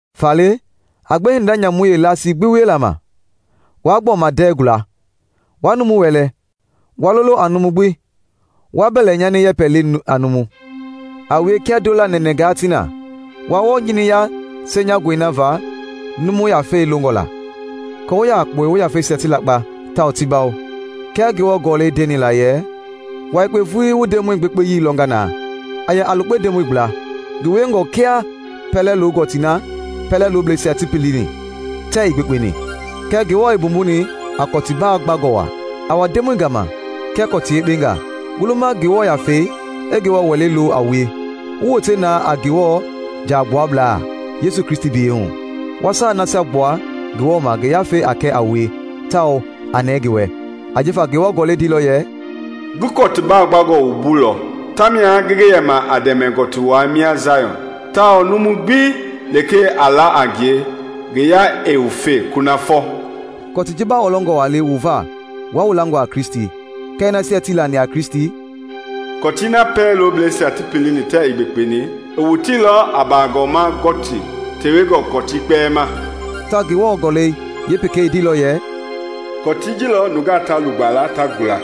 Faale, a gbe hinda nyamui yeelasii gbi wiela ma; waa gbɔma ndɛɛ guala, waa numu wɛlɛ, waa lolo a numu gbi, waa mbɛlɛnyani yɛpɛ le a numu. A wie kia ndoola nɛnɛɛngaa ti na, wa wɔɔ nyiniya senyangɔi na va numu yafei longɔ la, aako wu yɛ a kpɔle wu yafeisia ti lakpa tawao ti bawo. Kia Ngewɔ Gɔlɛi ndeni la yɛ, “Wua yekpe vulii wu Ndemɔi gbekpeyii lɔnga na.” A yɛ a lukpe Ndemɔi gbla. Ngi wiengɔe kia pɛlɛ- lo-gɔtii na pɛlɛ loblɛisia ti pilini tɛɛ ii gbekpeni kɛɛ Ngewɔ i mbumbuni a kɔtu baagbangɔ waa. A wa Ndemɔi gama kia kɔtii yekpengaa, wu luma Ngewɔ Yafei i Ngewɔ Wɛlei lo a wue, wu wote na a Ngewɔ jaagbuablaa Yesu Kristi biyɛi hu, wa saai nasia gbua Ngewɔ ma ngi Yafei a kɛ a wue tawao a nɛɛ ngi wɛ. Ajifa Ngewɔ Gɔlɛi ndeilɔ yɛ, “Ngi kɔtu baagbangɔ wumbuilɔ, tamia ngi ngi yɛma a dɛmɛ gɔtiwai mia Jayɔn; tawao numu gbi lekee a la a ngie, ngi yaa ɛɛ wufe kunafɔ.” Kɔtii ji baa wɔlɔngɔ waa le wu va wua wu langɔ a Kristi; kɛɛ nasia tii lani a Kristi: “Kɔtii na pɛlɛ loblɛisia ti pilini tɛɛ ii gbekpeni, i woteilɔ a bagɔma gɔtii tewengɔ kɔtii kpɛlɛɛ ma.” Tawao Ngewɔ Gɔlɛi yeepekei i ndeilɔ yɛ, “Kɔtii ji lɔ nungaa ta lugba la, ta gula.”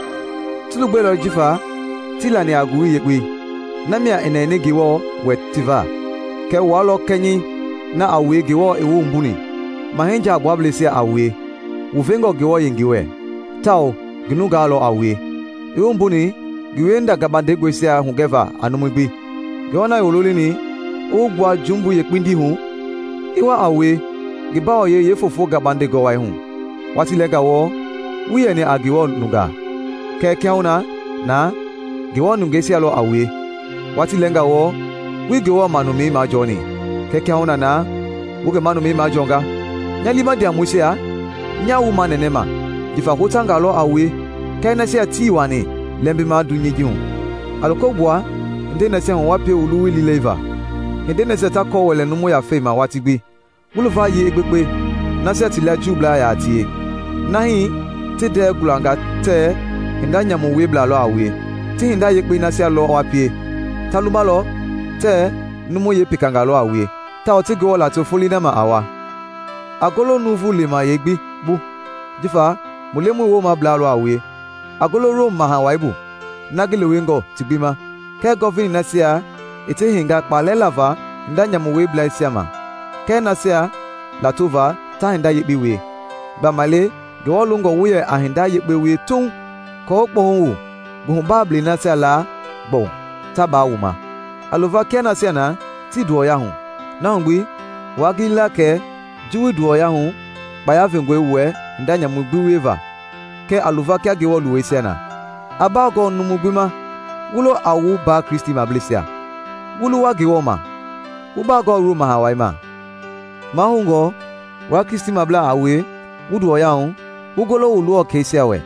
Ti lugbɛilɔ jifa tii lani a Ngowili Yekpei; namia i nɛni Ngewɔ wɛ ti va. Kɛɛ wua lɔ kɛnyɛi na a wue Ngewɔ i wu mbumbuni, mahɛi jaagbuablɛisia a wue, wu vengɔ Ngewɔ yengei wɛ, tawao ngi nungaa lɔ a wue, i wu wumbuni ngi wiehinda gabandengɔisia hugɛva a numui gbi, Ngewɔ na i wu lolini i wu gbua jumbui yeekpindii hu, i wa a wue ngi bawoyɛi yeefoofo gabandengɔ wai hu. Watii lɛɛnga wɔɔ, wuii yɛni a Ngewɔ nungaa, kɛɛ kiahuna na ngi nungeisia lɔ a wue; watii lɛɛnga wɔɔ, wuii Ngewɔ manumɛi majɔɔni, kɛɛ kiahuna na wu ngi manumɛi majɔɔnga. Nya liima ndiamɔisia, nyaa wu manɛnɛma jifa hotangaa lɔ a wue kɛɛ nasia tii wani lɛmbima dunyei ji hu! A loko gbua hindei nasia hu wa pie wu luwui liilɛliva, hindei nasia ta kɔ wɛlɛ numu yafei ma watii gbi. Wu luvayii i gbekpe nasia ti lia Juublaa yaa tie, nahi ti ndɛɛ gualangaa tɛɛ hinda nyamu wieblaa lɔ a wue, ti hinda yekpei nasia lɔ wa pie, ta lumalɔ tɛɛ numu yekpengaa lɔ a wue, tawao ti Ngewɔ lato folei na ma a wa. A golo nuuvu lemaya gbi bu jifa mu Lemɔi woomablaa a wue; a golo Rom Maha Wai bu, na ngi lewengɔ ti gbi ma, kɛɛ Gɔvinɛi nasia i ti heinga kpaalɛ lava hinda nyamu wieblɛisia ma kɛɛ nasia lato va ta hinda yekpe wie. Gbamaile Ngewɔ longɔ wu yɛ a hinda yekpe wie tuuŋ aako wu kpɔhu wu nguhubaablei nasia laa gbɔwu ta baa wu ma. A luva kia nasia na tii nduwɔyahu, na hu gbi waa gili la kɛ ji wuii ndɔwuya hu kpaya vengɔi wu wɛ hinda nyamu gbi wieva, kɛɛ a luva kia Ngewɔ luweisia. A baagɔɔ numu gbi ma, wu lo a wu mbaa Kristimableisia, wu luwa Ngewɔ ma, wu baagɔɔ Rom Maha Wai ma. Mahoungɔ wua Kristimablaa a wue wu nduwɔya hu, wu golo wu luwɔkɛisia wɛ,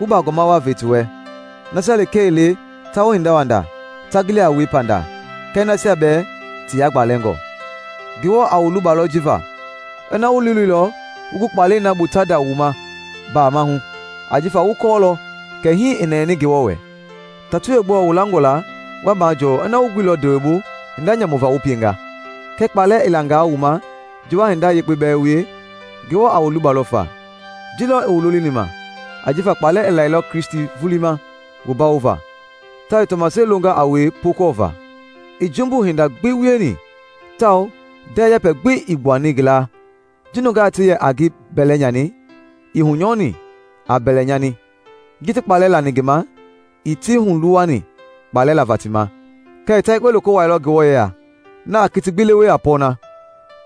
wu baagɔma waa ve ti wɛ, nasia lekee ii le ta wu hindawanda ta gili a wue pandaa, kɛ nasia bɛɛ ti yagbalɛngɔ. Ngewɔ a wu lubalɔ ji va, ina wu liiloilɔ wu gu kpalɛi na bu ta nda wu ma mbaama hu, ajifa wu kɔɔlɔ kɛ hii i nɛni Ngewɔ wɛ. Tatoi yeegbɔɔ wu langɔ la wa majɔɔ ina wu guilɔ ndewe bu hinda nyamu va wu pienga? Kɛɛ kpaalɛ i langaa wu ma ji wa hinda yekpe bɛɛ wie, Ngewɔ a wu lubalɔ fa. Ji lɔ i wu lolini ma, ajifa kpaalɛ i lailɔ Kristi vulii ma wu bawova, tawao i tɔmaseli longa a wue pookɔɔva. Ii jumbu hinda gbi wieni tawao ndɛɛ yɛpɛ gbi ii gbuani ngi laa. Ji nungaa ti yɛ a ngi bɛlɛ nyani, ii hunyɔni a mbɛlɛnyani; ji ti kpaalɛ lani ngi ma, ii ti huluwani kpaalɛ lava ti ma, kɛɛ i ta yekpe loko wuaailɔ Ngewɔ yeya, na a kiti gbi lewe a pɔɔna.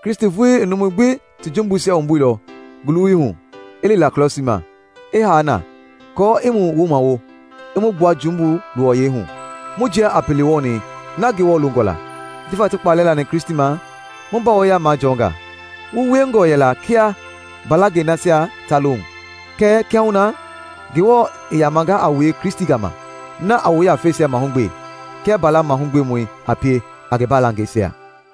Kristi vulii i numui gbi ti jumbuisia wumbuilɔ ngi luwui hu i li la krɔsii ma, i haa na aako i mu wumawo i mu gbua jumbui luwɔyɛi hu, mu jia a pele wɔɔni na Ngewɔ longɔ la. Jifa ti kpaalɛ lani Kristi ma, mu mbawoya majɔɔnga. Wu wiengɔ yɛla kia mbalangɛi nasia ta lohu, kɛɛ kiahuna na Ngewɔ i yamanga a wue Kristi gama, na a wu yafeisia mahugbe kia mbala mahugbemɔi a pie a ngi baalangɛisia.